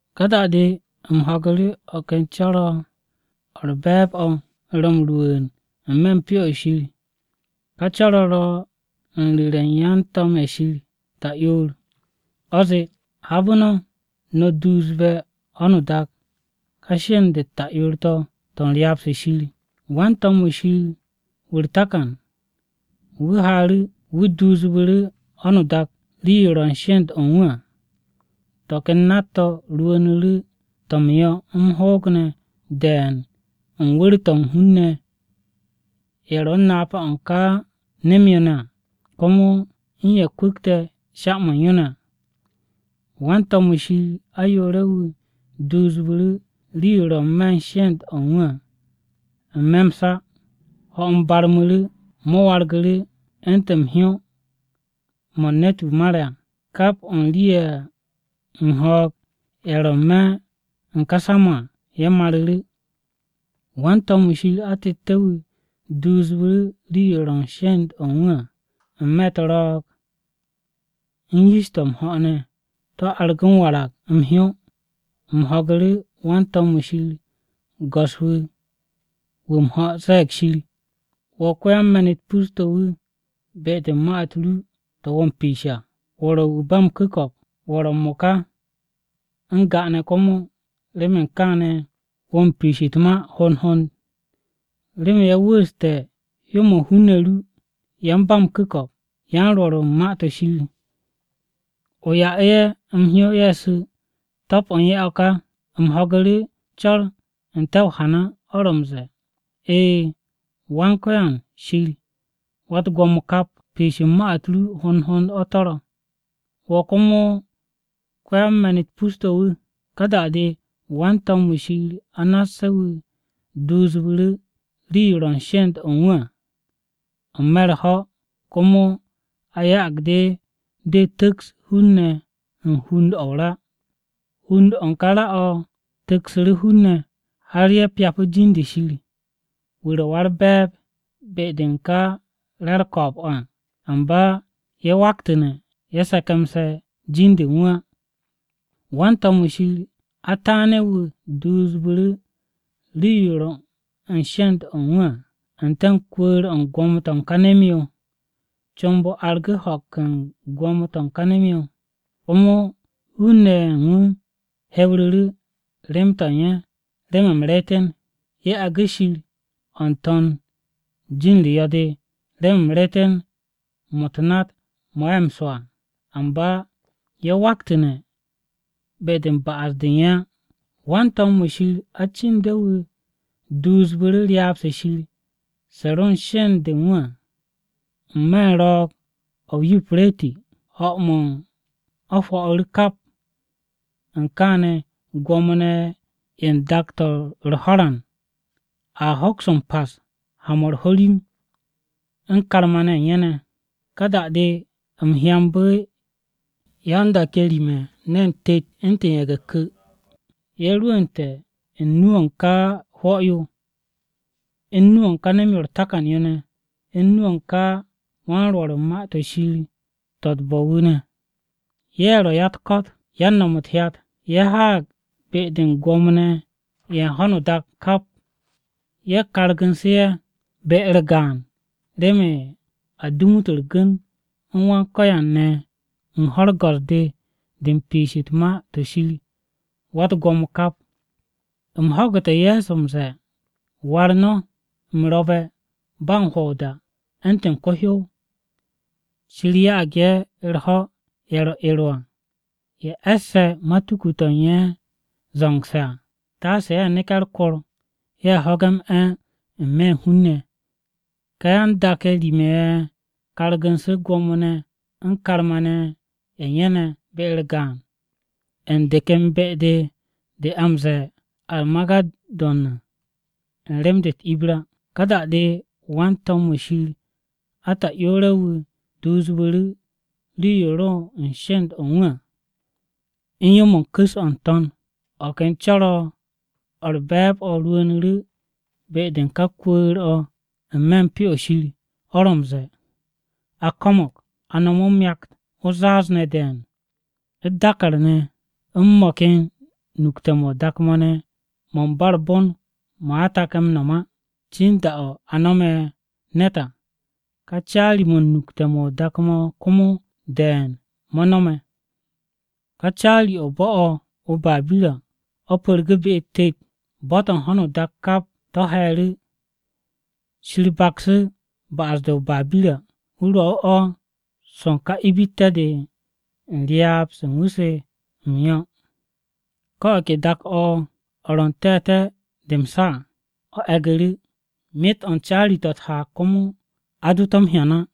Ka da-de u̱m ho̱gu̱ru̱ o̱ ken co̱r-o̱ o̱ u̱r-be̱e̱b o̱ ro̱ m-rwu̱u̱n n-me̱ u̱n Pyo-o̱ Shir, ka co̱r-o̱ ro̱ u̱n ru̱re̱ u̱n yan-to̱m-ye̱ Shir ta'yoor. O̱ zee, “Habe̱ no̱, no̱ duusbe̱ ho̱no o-dak ká sheend-u̱t ta'yoor-to̱, to̱ u̱n ryaab-se Shir.” Wan-to̱m-wu̱ Shir wu̱ u̱r-takan, wu̱ haaru̱ wu̱ duusbu̱ru̱ ho̱no o-dak rii-yo ro̱ u̱n sheend-o̱ u̱n wu̱ à. To̱ ken nat-to̱ rwu̱u̱nu̱ru̱ to̱ m-yo̱ m-hoog ne̱ de̱e̱n u̱n wu̱r-to̱ u̱n ka hun-ne̱ ye̱ ro̱ u̱n napa-o̱ u̱n ka nem-yo ne̱ à, komo u̱n ye̱ kwu̱kte̱ sha-mo̱ u̱n yo ne̱ à. Wan-to̱m-wu̱ Shir ayoore̱-wu̱ duusbu̱ru̱ rii-yo ro n-me̱ u̱n sheend-o̱ u̱n wu̱ à n-me̱ m-sa. Ho̱-m barmu̱ru̱, mo̱ wargu̱ru̱ u̱ntu̱n hyó-mo̱ u̱n ne̱t-wu̱ mare̱ à, kap o̱ u̱n rii-ye̱ u̱n ho̱o̱g-ye̱ ro n-me̱ u̱n ká sa-mo̱ à ye̱ maru̱ru̱. Wan-to̱m-wu̱ Shir atette̱-wu̱ duusbu̱ru̱ rii-yo ro̱ u̱n sheend-o̱ u̱n wu̱ à n-me̱ u̱t-ro̱o̱g u̱n yish-to̱ m-ho̱ ne̱, to̱ argu̱ m-warag m-hyó. U̱m ho̱gu̱ru̱ wan-to̱m-wu̱ Shir go̱s-wu̱ wu̱ m-ho̱ ze̱e̱g Shir, “Wo̱ ko-yan-me̱n-u̱t pus-to̱ wu̱ be-de u̱n ma-u̱t ru to̱ wo̱ m-piish à. Wo̱ ro̱ Wu̱ ba m-Ku̱ko̱p, wo̱ ro̱ m-mo̱ka, n-ga ne̱ komo. Remen kaane̱ wo̱ m-piish u̱t-ma hond hond. Remen ye̱ wu̱u̱ste̱ hyó-mo̱ u̱n hun-ne̱ ru: yan-ba-m-ku̱ko̱p u̱n yan-rwo̱r u̱n Ma-to̱ Shir ne̱. O ya'u̱ru̱ ye̱ m-hyó ye̱ su̱. Top-o̱ u̱n ye̱ o̱ ká!” U̱m ho̱gu̱ru̱ co̱r n-te̱ o-hana o̱ ro̱ m-ze̱e̱. “E̱e̱, Wan-Ko̱yan Shir Wa-u̱t-Gwo̱mo kap! Piish u̱n ma-u̱t ru hond hond to̱ ro̱, wo̱ komo ko-yan-me̱n-u̱t pus-to̱ wu̱.” Ka da-de wan-to̱m-wu̱ Shir anasse̱-wu̱ duusbu̱ru̱ rii-yo ro̱ u̱n sheend-o̱ u̱n wu̱ à n-me̱ u̱r-ho̱. Komo a ya'ag de de tu̱ks hun-ne̱ u̱n hund-o̱ ra. Hund-o̱ u̱n ka o-ra o̱ tu̱ksu̱ hun-ne̱, har ye̱ pyapu̱ jin-de Shir, wu̱ ro̱ Wa-u̱r-Be̱e̱b be-de u̱n ka re̱ u̱r-ko̱o̱b o̱ à. Amba ye̱ waktu̱ne̱ ye̱ se̱ke̱mse̱ jin-de u̱n wu̱ á. Wan-to̱m-wu̱ Shir ataane̱-wu̱ duusbu̱ru̱ rii-yo ro u̱n sheend-o̱ u̱n wu̱ à n-te̱ u̱n kwu̱u̱r-o̱ u̱n gwo̱mo-to̱ u̱n ka nem-yo. Comb-o argu̱ ho̱k u̱n gwo̱mo-to̱ u̱n ka nem-yo, komo hun-ne̱ ye̱ u̱n wu̱ hewru̱ru̱ rem-to̱ u̱n ye̱ remen m-reeten. Ye̱ agu̱ Shir o̱ n-To̱n u̱n jin-u̱r yo̱-de remen m-reeten mo̱ u̱t-nat mo̱ ye̱ m-swo̱ à. Amba ye̱ waktu̱ne̱ be-de u̱n ba'as-de u̱n ye̱ á. Wan-to̱m-wu̱ Shir acinde̱-wu̱ duusu̱ru̱ ryaab-se Shir se ro u̱n sheend-o̱ u̱n wu̱ à n-me̱ u̱n ro̱o̱g-o̱ o-Yupireti. Ho̱-mo̱ u̱n o̱ hwo̱'u̱ru̱ kap. U̱n kaane̱, gwo̱mo-ne̱ ye̱ u̱n dak-to̱ u̱r-ho̱ran a hoks m-pas ha-mo̱ u̱r-ho̱rim u̱n karma-ne̱ ye̱ u̱n ye̱ ne̱. Ka da-de u̱m hyambu̱ yan-dak-ye̱ rim-ye̱ ne̱n tet u̱ntu̱n ye̱ge̱-ku̱. Ye̱ rwu̱u̱nte̱ u̱n nu-o̱ u̱n ka hwo̱-yo, u̱n nu-o̱ u̱n ka nem-yo ne̱, u̱n nu-o̱ u̱n ka wan-rwo̱r u̱n Ma-to̱ Shir to̱, to̱ u̱t-bo̱. Ye̱ ya-u̱t-ko̱t ye̱, yan-no̱m u̱t-hyat, ye̱ haag be-de u̱n gwo̱mo-ne̱ ye̱ u̱n ho̱no o-dak kap, ye̱ kargu̱nsu̱ ye̱ be-u̱r gaan remen a gu̱n-u̱t u̱r-gu̱n u̱n Wan-Ko̱yan ne̱ u̱n ho̱-u̱r go̱s-de de u̱n piish u̱t-ma to̱ Shir Wa-u̱t-Gwo̱mo kap. U̱m ho̱gu̱te̱ Ye̱so m-ze̱e̱, “War no̱: u̱m ro̱be̱ ba u̱n hwo̱ o-da u̱ntu̱n ko-hyow! Shir ya'ag ye̱ u̱r-ho̱ ye̱ ro̱ ero à, ye̱ e̱sse̱ matuku-to̱ u̱n ye̱ zo̱ngse̱ à, taase ye̱ neke̱ u̱r-kor, ye̱ ho̱ge̱ m-'e̱ n-me̱ u̱n hun-ne̱!” Ka yan-dak-ye̱ rim-ye̱ ye̱ kargu̱nsu̱ gwo̱mo-ne̱ u̱n karma-ne̱ ne̱ u̱n ye̱ ne̱ be-u̱r gaan, u̱n de ken be-de a m-ze̱e̱ Armagedon à u̱n rem-de u̱t-Ibra. Ka da-de wan-to̱m-wu̱ Shir ata'yoore̱-wu̱ duusbu̱ru̱ rii-yo ro u̱n sheend-o̱ u̱n wu̱ à u̱n yo-mo̱ u̱n ku̱s-o̱ u̱n n-to̱n. O̱ ken co̱r-o̱ u̱r-be̱e̱b o̱ rwu̱u̱nu̱ru̱ be-de u̱n ká kwu̱u̱r-o̱ n-me̱ u̱n Pyo-o̱ Shir, o̱ ro̱ m-ze̱e̱, “A ko̱mo̱g!” A no̱mu̱ o-myakt, o-zaaz ne̱ de̱e̱n, u̱t-dàkàr ne̱, u̱n mo̱ ken nukte̱-mo̱ o-dak mo̱ ne̱ mo̱ u̱n ba u̱r-bon mo̱ a take̱ m-no̱m á cin da-o̱ a no̱me̱ ne̱t à. Ka caari-mo̱ u̱n nukte̱-mo̱ o-dak mo̱ komo de̱e̱n mo̱ no̱me̱. Ka caari-o̱ o-bo̱ o̱ o-Babira o̱ pu̱rgu̱ be-u̱t tet, bo̱-to̱ u̱n ho̱n u̱t-dak kap to̱ he̱e̱ru̱. Shir baksu̱ ba'as-de o-Babira wu̱ rwo̱'u̱ o̱ swo̱ u̱n ka ibitte̱-de de u̱n ryaab-se u̱n wu̱ se m-yo̱. Ko̱ o̱ ke dak-o̱ o̱ ro̱ n-te̱te̱ de m-sa à o̱ e̱gu̱ru̱, myet-o̱ u̱n caari-to̱ u̱t-haag komo a do to̱ m-hyan á.